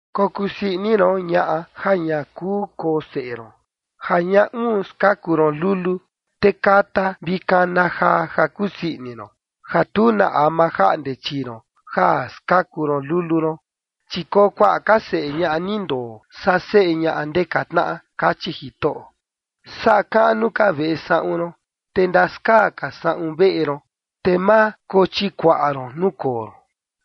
“Kokusii ini ron, ñaꞌa ja ña kuu koo seꞌe ron, ja ña uun skaku ron lulu, te kata vi kana jaa, ja kusii ini ron, ja tu na ama jaꞌnde chii ron ja skaku ron lulu ron, chi koo kuaꞌa ka seꞌe ñaꞌa ni ndoo, saa seꞌe ñaꞌa ndeka tnaꞌa”, kachi Jitoꞌo. “Saꞌa kaꞌnu ka veꞌe saꞌun ron, te ndaskaa ka saꞌun veꞌe ron, te ma kochikuaꞌa ron nuu koo ron.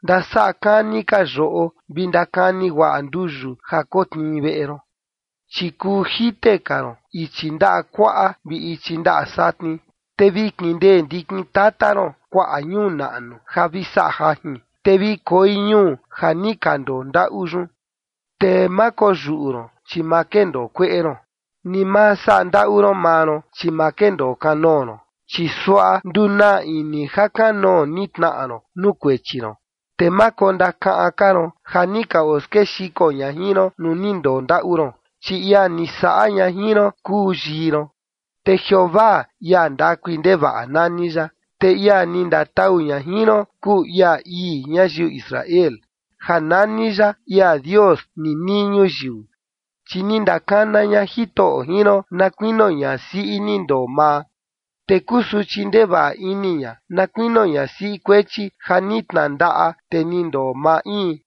Ndasaꞌa kani ka yoꞌo vi ndakani guaꞌa nduyu ja kotnii veꞌe ron. Chi kuu jite ka ron ichi ndaꞌa kuaꞌa vi ichi ndaꞌa satni, te vi kindee ndikin tata ron kuaꞌa ñuu naꞌnu ja vi saꞌa jajin, te vi koi ñuu ja ni ka ndondaꞌu yun. Te ma koyuꞌu ron, chi ma kendoo kueꞌe ron ni ma saꞌa ndaꞌu ron maa ron, chi ma kendoo kanoo ron, chi suaꞌa ndunaa ini ja kanoo ni tnaꞌa ron nuu kuechi ron, te ma kondakaꞌan ka ron ja ni ka oskexiko ña jin ron nuu ni ndondaꞌu ron. Chi ia ni saꞌa ña jin ron kuu yii ron, te Jeovaa, ia ndakui ndevaꞌa, nani ya, te ia ni ndatau ña jin ron kuu ia ii ñayiu Israel, ja nani ya ia Dios ninii ñuyiu. Chi ni ndakana ña Jitoꞌo jin ron na kuinio ñasiꞌi ni ndoo maa, te kusuchi ndevaꞌa ini ña, na kuinio ñasiꞌi kuechi ja ni tnandaꞌa te ni ndoo maa in”,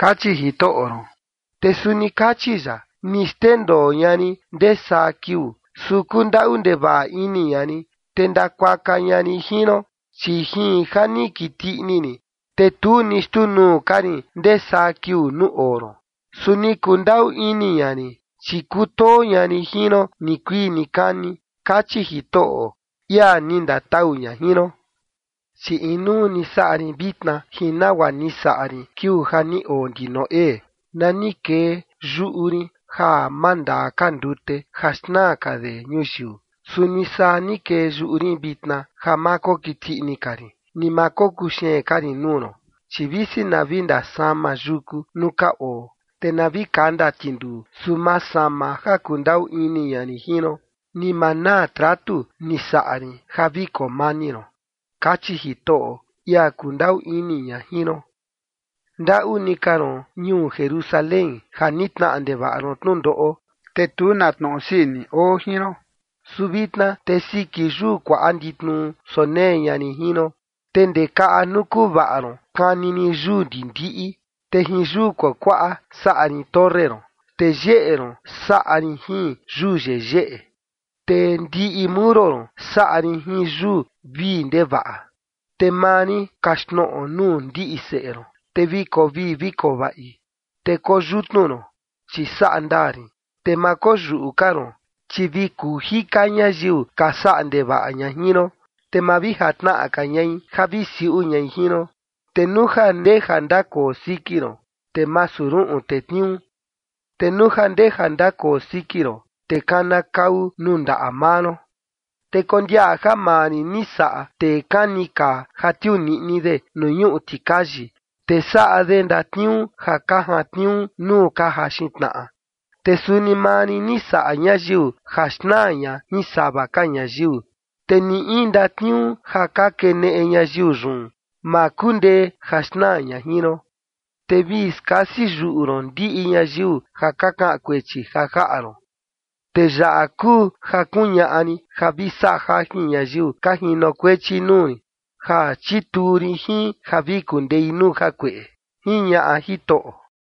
kachi Jitoꞌo ron. Te suni kachi ya: “Ni xndendoo ña rin ndee saa kiuu, su kundaꞌu ndevaꞌa ini ña rin, te ndakuaka ña rin jin ron. Chi jin ja ni kiti ini rin, te tu ni xtuu nuu ka rin ndesaa kiuu nuu oo ron, su ni kundaꞌu ini ña rin, chi kutoo ña rin jin ron nikuii nikani”, kachi Jitoꞌo, ia ni ndatau ña jin ron. “Chi inuu ni saꞌa rin vitna jin nagua ni saꞌa rin kiuu ja ni oo ndi Noé, nani kee yuꞌu rin ja ma ndaa ka ndute ja xnaa ka de ñuyiu. Suni saa ni kee yuꞌu rin vitna ja ma kokiti ini ka rin, ni ma kokuxeen ka rin nuu ron. Chi visi na vi ndasama yuku nuu ka oo, te na vi kanda tinduu, su ma sama ja kundaꞌu ini ña rin jin ron, ni ma naa tratu ni saꞌa rin ja vi koo mani ron”, kachi Jitoꞌo, ia kundaꞌu ini ña jin ron. “Ndaꞌu ni ka ron, ñuu Jerusalén ja ni tnaꞌa ndevaꞌa ron tnundoꞌo, te tu na tnoꞌo sii ini oo jin ron. Su vitna te siki yuu kuaꞌa nditnuu sonee ña rin jin ron, te ndee kaꞌa nuu kuvaꞌa ron kani rin yuu ndindiꞌi. Te jin yuu kuakuaꞌa saꞌa rin torre ron, te yeꞌe ron saꞌa rin jin yuu yeyeꞌe, te ndiꞌi muro ron saꞌa rin jin yuu vii ndevaꞌa. Te maa rin kaxtnoꞌo nuu ndiꞌi seꞌe ron, te vi koo vii vi koo vaꞌi. Te koyutnu ron, chi saꞌa ndaa rin, te ma koyuꞌu ka ron, chi vi kuu jika ñayiu ka saꞌa ndevaꞌa ña jin ron, te ma vi jatnaꞌa ka ñai ja vi siuꞌu ñai jin ron. Te nuu ja ndeja ndakoo siki ron, te masu ruꞌun tetniuu, te nuu ja ndeja ndakoo siki ron, te kanakau nuu ndaꞌa maa ron. Te kondiaꞌa ja maa rin ni saꞌa tee kani kaa ja tiuu niꞌni de nuu ñuꞌu tikayi, te saꞌa de ndatniuu ja ka jantniuu nuu ka jaxin tnaꞌa. Te suni maa rin ni saꞌa ñayiu ja xnaa ña jin sava ka ñayiu. Te ni in ndatniuu ja ka keneꞌe ñayiu yun, ma kundee ja xnaa ña jin ron. Te vi skasi yuꞌu ron ndiꞌi ñayiu ja ka kaꞌan kuechi ja jaꞌa ron. Te yaꞌa kuu ja kuñaꞌa rin ja vi saꞌa jajin ñayiu ka jinokuechi nuu rin, ja chituu rin jin ja vi kundei nuu jakueꞌe”, jiñaꞌa Jitoꞌo.